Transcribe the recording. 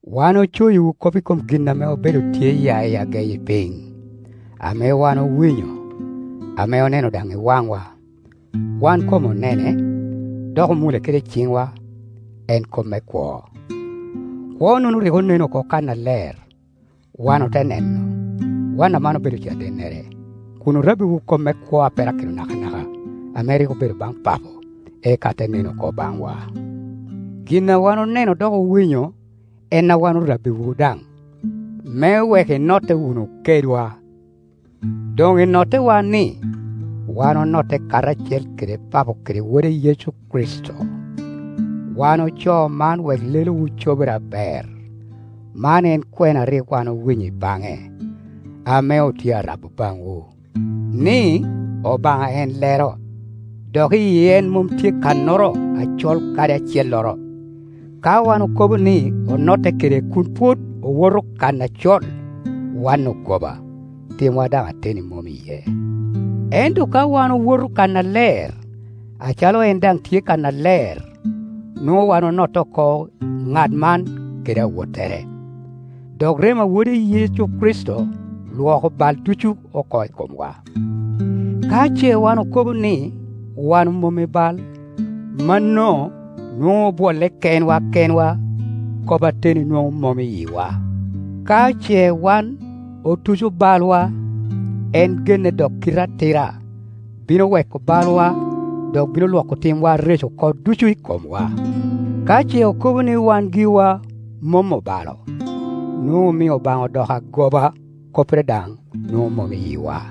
Wan ocoyiwu kop i kom gin ame obedo tye ya i ageyi piny, ame wan owinyo, ame oneno daŋ i waŋwa. Wan kom onene, dok omule kede ciŋwa, en Kop me kwo. Kwo-nono rik onen oko kannaler, wan ote neno. Wan aman obedo cadennere, kun orabbiwu kop me kwo a perakino nakanaka ame rik obedo baŋ Papo, eka te nen oko baŋwa. Gin a wan oneno dok owinyo, en a wan orabbiwu daŋ, me wek inotte wunu kedwa. Doŋ i nottewa-ni, wan onotte karacel kede Papo kede Wode Yecu Kricito. Wan ocoo man wek lelowu cobere aber. Man en kwena a rik wan owinyo i baŋe, ame otye a rabo baŋwu, ni, Obaŋa en lero, dok i en mom tye kannoro acol kadi acelloro. Ka wan okobo ni onotte kede kun pwod owoto kan acol, wan ogoba, timwa daŋ ateni mom iye. Ento ka wan owoto kannaler, acalo en daŋ tye kannaler, nwoŋo wan onotte oko ŋat man kede awottere, dok remo a wode Yecu Kricito Iwoko bal ducu oko i komwa. Ka ce wan okobo ni wan omom i bal, mano nwoŋo obwolle kenwa kenwa, kop ateni nwoŋo mom i yiwa. Ka ce wan oluco balwa, en genne dok kite atira, bino weko balwa, dok bino Iwoko timwa areco oko ducu i komwa. Ka ce okobo ni wan giwa mom obalo, nwoŋo omio Obaŋa odoko agoba, koppere daŋ nwoŋo mom i yiwa.